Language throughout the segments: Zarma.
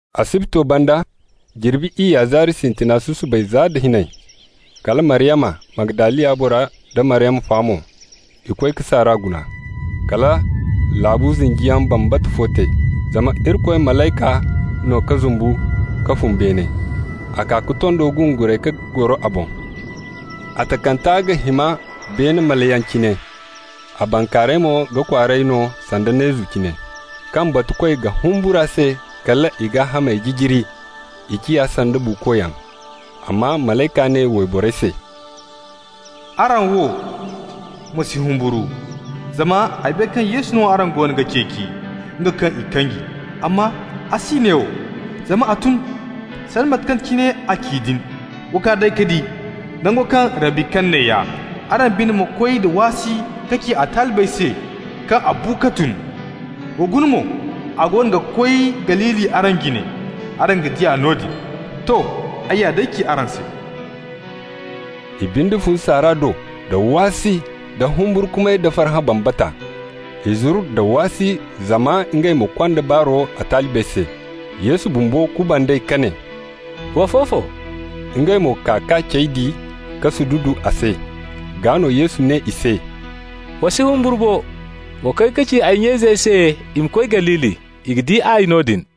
Asibto banda, jirbi iyya zaari sintina susubay za da hinay, kala Maryama Magdaliya bora da Maryama fa mo, i koy ka saara guna. Kala laabu zinjiyaŋ bambata fo te, zama Irikoy malayka no ka zumbu ka fun beene, a kaa ka tondo gunguray ka goro a boŋ. A takanta ga hima beene maliyaŋ cine, a bankaaray mo ga kwaaray no sanda neezu cine. Kaŋ batukoy ga humbur'a se kal i gaahamey jijiri, i ciya sanda buukoyaŋ. Amma malayka ne wayborey se: «Araŋ wo, ma si humburu, zama ay bay kaŋ Yesu no araŋ goono ga ceeci, nga kaŋ i kanji. Amma a si neewo, zama a tun, sanda mate kaŋ cine a ci din. Wa kaa day ka di. Nango kaŋ Rabbi kani neeya. Araŋ binde ma koy da waasi ka ci a talibey se kaŋ a bu ka tun. Wa guna mo, a goono ga koy Galili araŋ jine. Araŋ ga di a noodin. To, ay ya day ci araŋ se.» I binde fun saara do da waasi da humburkumay da farhã bambata. I zuru nda waasi zama ngey ma konda baaro a talibey se. Yesu bumbo kuband'ey ka ne: «Wa fofo!» Ngey mo kaa k'a cey di ka sududu a se. Gaa no Yesu ne i se: «Wa si humburu bo. Wa koy ka ci ay nya-izey se i ma koy Galili. I ga di ay noodin.»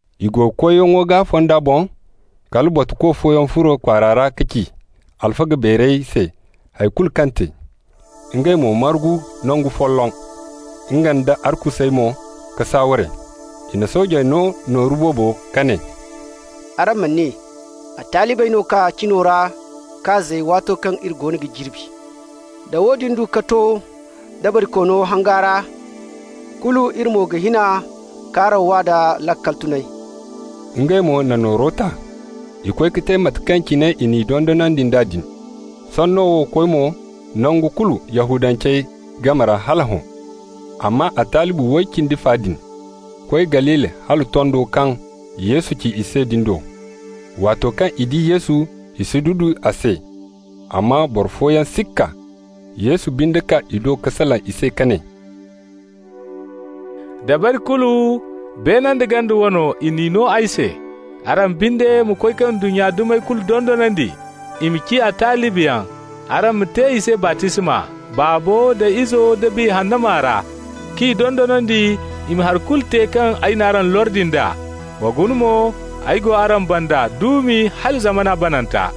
I go koyyaŋo gaa fonda boŋ, kala batuko fooyaŋ furo kwaara ra ka ci alfaga beerey se hay kulu kaŋ te. Ngey mo margu nangu folloŋ, ngey nda arkusey mo ka saaware. I na soojey no nooru boobo ka ne: «Araŋ ma ne: ‹A talibey no ka kaa cino ra k'a zay waato kaŋ iri goono ga jirbi.› Da woodin du ka to dabarikoono hanga ra, kulu iri mo ga hin a k'araŋ waa da laakal tunay.» Ngey mo na nooro ta. I koy ka te mate kaŋ cine i n'i dondonandi nd'a din. Sanno wo koy mo nangu kulu Yahudancey game ra hala hõ. Amma a talibi way cindi fa din koy Galili hala tondo kaŋ Yesu ci i se din do. Waato kaŋ i di Yesu, i sududu a se, amma boro fooyaŋ sikka. Yesu binde kaa i do ka salaŋ i se ka ne: «Dabari kulu, beene nda ganda wane, i n'i no ay se. Araŋ binde ma koy ka ndunnya dumey kulu dondonandi i ma ciya talibiyaŋ. Araŋ ma te i se baptisma Baabo da Izo da Biya Hanna maa ra, k'i dondonandi i ma hari kulu te kaŋ ay n'araŋ lordi nd'a. Wa guna mo, ay go araŋ banda duumi hala zamana bananta.»